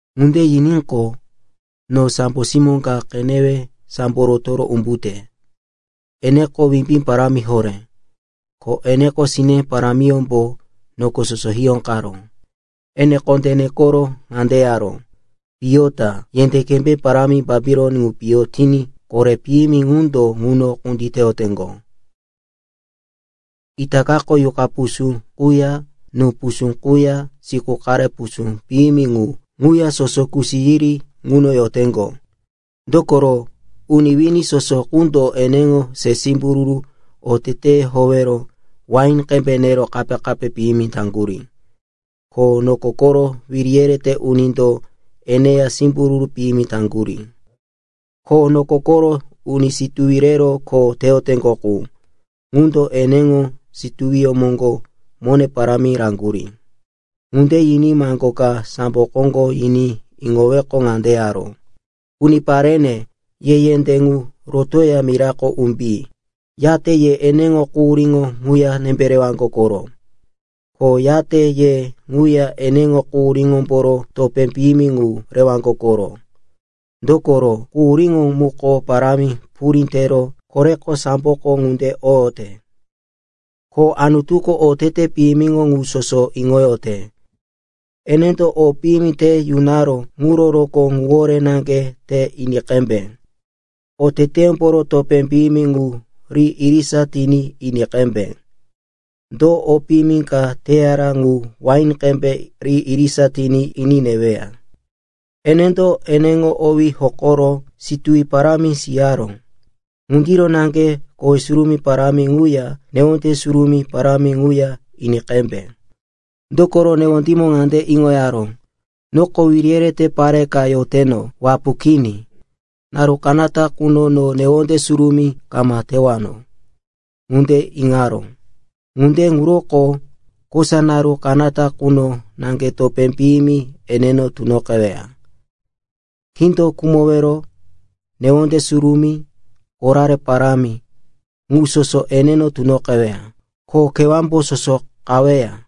Ŋunde yiníqo, no sambo simó ka qenewe sambo rotoro umbute. Eneko wimbí parámi horé, ko eneŋo sine parámiyómbo noko soso hiyóqaró. Ene kondé nekoro ŋande yaró, “Piyo ta! Yendé kembé parámi Bapilon ŋu piyo tiní kore piyimi qundo ŋuno kunditeyoteŋgo. Itakako yuqa pusú quya, nú pusú quya siku qare pusú piyimi mu ŋuya soso kusi yiri ŋuno yoteŋgo. Dokoro uni wini soso qundo eneŋo se simbururu oteteyó howero wain qembe nero kape-kape piyimi taŋgurí, ko noko koro wiri yerete unindo eneya simbururu piyimi taŋgurí, ko noko koro uni situwi rewero kho teyoteŋgo qu, ŋundo eneŋo situwiyó moŋgo mone parámi raŋgurí.” Ŋunde yiní maŋgo ka sambo koŋgo yiní iŋoweqo ŋande yaró, “Uniparene, ye yendé ŋu rotoya mirako umbi. Yate ye eneŋo quhuríŋo ŋuya nembe rewaŋgo koro. Ko yate ye ŋuya eneŋo quhuríyómboro topé piyimi ŋu rewaŋgo koro. Dokoro quhuríŋo muko parámi purí tero koreko samboko ŋunde oyote. Ko Anutuko otete piyimiŋo ŋu soso iŋoyote. Enendo o piyimi te yunaró ŋuro rokó ŋuwore naŋge te ini qembe. Oteteyómboro topé piyimi ŋu ri irisa tiní ini qembe. Do o piyimi ka teyara ŋu wain qembe ri irisa tiní ini neweya. Enendo eneŋo owí hokoro situwi parámi siyara. Ŋundiro naŋge kowe surumí parámi ŋuya newonde surumí parámi ŋuya ini qembe. Dokoro newondímo ŋande iŋoyaró, ‘Noko wiri yerete pare ka yoteno, wapu kini, naru kanata quno no newonde surumí kama tewano,’ ŋunde iŋaró. Ŋunde ŋuroko kosa naru kanata quno naŋge topé piyimi eneno tunoqeweya. Kindo khumowero, newonde surumí, korare parámi, ŋu soso eneno tunoqeweya, ko kewámbo soso qaweya.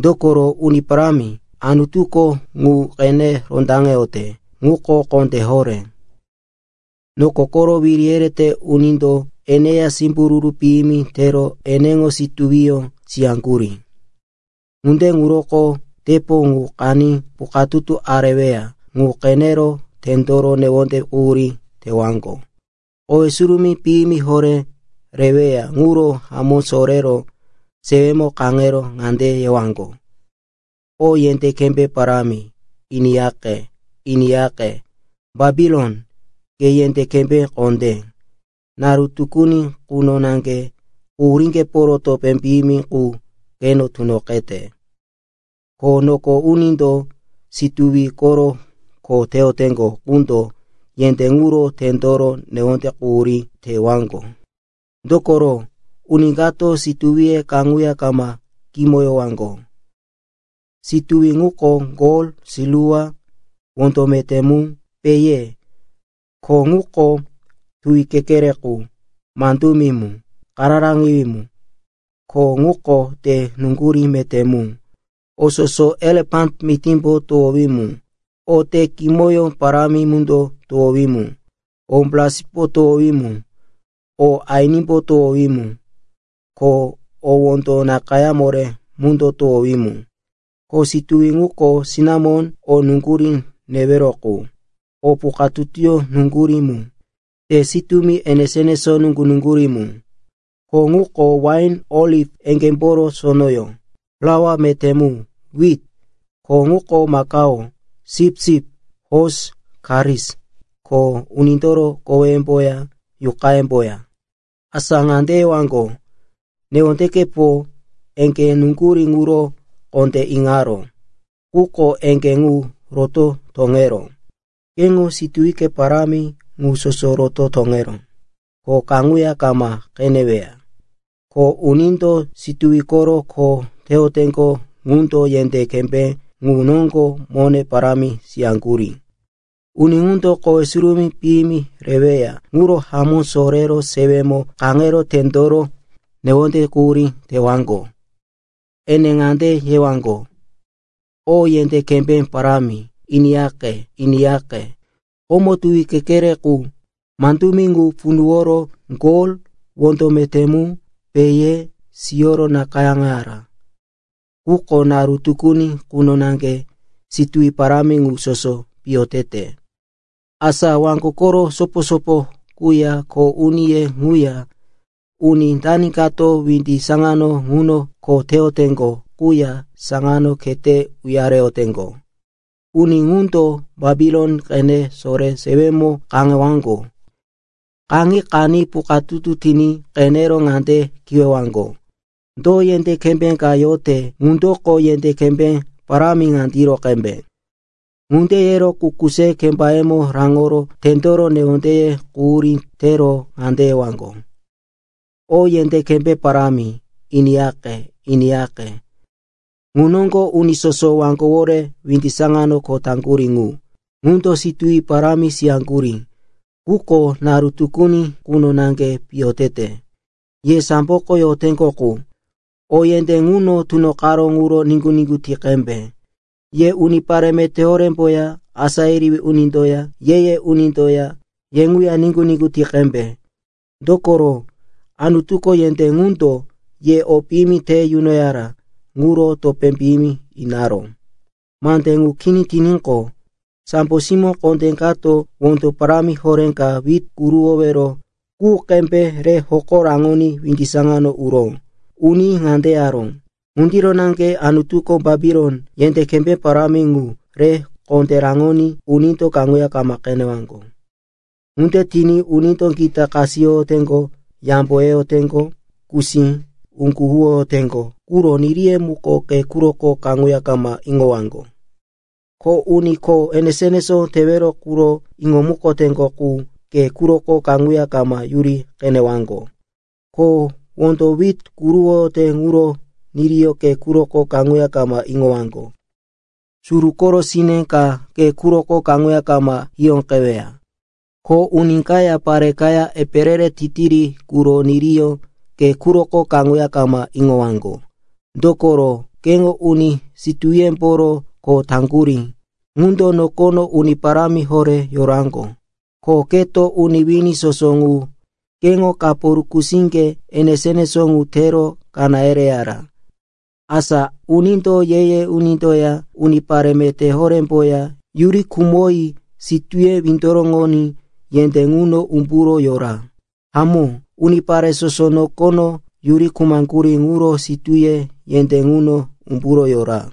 Dokoro Uni Parámi, Anutuko ŋu qene rondaŋeyote, ŋuko kondé horé. “Noko koro wiri yerete unindo eneya simbururu piyimi tero eneŋo situwiyó siyaŋgurí. Ŋunde ŋuroko tepo ŋu qaní pukatutu areweya ŋu qenero tendoro newonde quhurí tewaŋgo. Kowe surumí piyimi horé reweya ŋuro hamó sorero sewemo kaŋero ŋande yewaŋgo, “O yendé kembé parámi, iniyaqe, iniyaqe! Bapilon, ke yendé kembé kondé! Naru tukuni quno naŋge quhuríŋgeporo topé piyimi qu keno tunoqete!” Ko noko unindo situwi koro kho teyoteŋgo qundo yendé ŋuro tendoro newonde quhurí tewaŋgo. Dokoro uni kato situwiye kaŋuya kama kimoyowaŋgo. Situwi ŋuko gol, silwa, wondo meté mu, pehe. Ko ŋuko tuwi kekere qu, mandumi mu, kararaŋiwí mu. Ko ŋuko te nuŋgurí meté mu, o soso elefan mitímbo towowí mu, o te kimoyó parámi mundo towowí mu, o braspo towowí mu, o ainimbo towowí mu, ko o wondo nakayá moré mundo towowí mu. Ko situwi ŋuko sinamon, o nuŋgurí newero qu, o pukatutuyó nuŋgurí mu, te sitúmi enesó-enesó nuŋgu-nuŋgurí mu. Ko ŋuko wain, oliv eŋgémboro sonoyó, plaua meté mu, wit. Ko ŋuko makao, sipsip, hosi, karis, ko unindoro koweyemboya, yuqayemboya. Asa ŋande yewaŋgo, “Newondekepo eŋgé nuŋgurí ŋuro kondé iŋaró. Quko eŋgé ŋu roto toŋeró. Keŋo situwike parámi ŋu soso roto toŋeró, ko kaŋuya kama qeneweya.” Ko unindo situwi koro kho teyoteŋgo ŋundo yendé kembé ŋu noŋgo mone parámi siyaŋgurí, uni ŋundo kowe surumí piyimi reweya ŋuro hamó sorero sewemo kaŋero tendoro newonde quhurí tewaŋgo. Ene ŋande yewaŋgo, “O yendé kembé parámi, iniyaqe, iniyaqe! Komo tuwi kekere qu, mandumi ŋu punuworo gol, wondo meté mu, pehe siyoro nakayáŋoyara. Quko naru tukuni quno naŋge situwi parámi ŋu soso piyo tete!” Asa waŋgo koro sopo-sopo quya kho uniye ŋuya, uni dani kato windi saŋano ŋuno kho teyoteŋgo quya saŋano khete uyareyoteŋgo, uni ŋundo Bapilon qene sore sewemo kaŋewaŋgo. Kaŋi qaní pukatutu tiní qenero ŋande kiwewaŋgo, “Do yendé kembé ka yote ŋundoko yendé kembé parámi ŋandiro qembe?” Ŋunde yero kuku se kembayemo raŋoro tendoro newondeye quhurí tero ŋande yewaŋgo, “O yendé kembé parámi, iniyaqe, iniyaqe! Ŋu noŋgo uni soso waŋgowore windi saŋano kho taŋgurí ŋu, ŋundo situwi parámi siyaŋgurí, quko naru tukuni quno naŋge piyo tete. Ye samboko yoteŋgo qu, o yendé ŋuno tunoqaró ŋuro niŋgu-niŋgu ti qembe. Ye unipare meté horémboya, asá yerewí unindoya, ye-ye unindoya, ye ŋuya niŋgu-niŋgu ti qembe. Dokoro Anutuko yendé ŋundo ye o piyimi te yunoyara ŋuro topé piyimi inaró.” Mande ŋu kini tiníqo, sambo simó kondé kato wondo parámi horé ka wit kuruwowero qu qembe re hoko raŋoní windi saŋano uró. Uní ŋande yaró, “Ŋundiro naŋge Anutuko Bapilon, yendé kembé parámi ŋu, re kondé raŋoní unindo kaŋuya kama qenewaŋgo. Ŋunde tiní unindo gita kasiyoteŋgo, yambo yeyoteŋgo, kusí, uŋgu huwoyoteŋgo quro niriye muko ke quroko kaŋuya kama iŋowaŋgo. Ko uni kho enesó-enesó tewero quro iŋomukoteŋgo qu ke quroko kaŋuya kama yuri qenewaŋgo. Ko wondo wit kuruwoyote ŋuro niriyó ke quroko kaŋuya kama iŋowaŋgo. Suru koro sine ka ke quroko kaŋuya kama hiyóqeweya. Ko uni kaya pare kaya epe re-re titiri quro niriyó ke quroko kaŋuya kama iŋowaŋgo. Dokoro keŋo uni situwiyemboro kho taŋgurí ŋundo nokono uni parámi horé yoraŋgo, ko keto uni wini soso ŋu keŋo kapo rukusíŋge enesó-enesó ŋu tero kaná yereyara. Asa unindo ye-ye unindoya unipare meté horémboya yuri khumoyi sitúye windoroŋoní yendé ŋuno umburo yora. Hamó, unipare soso nokono yuri khumaŋgurí ŋuro sitúye yendé ŋuno umburo yora.”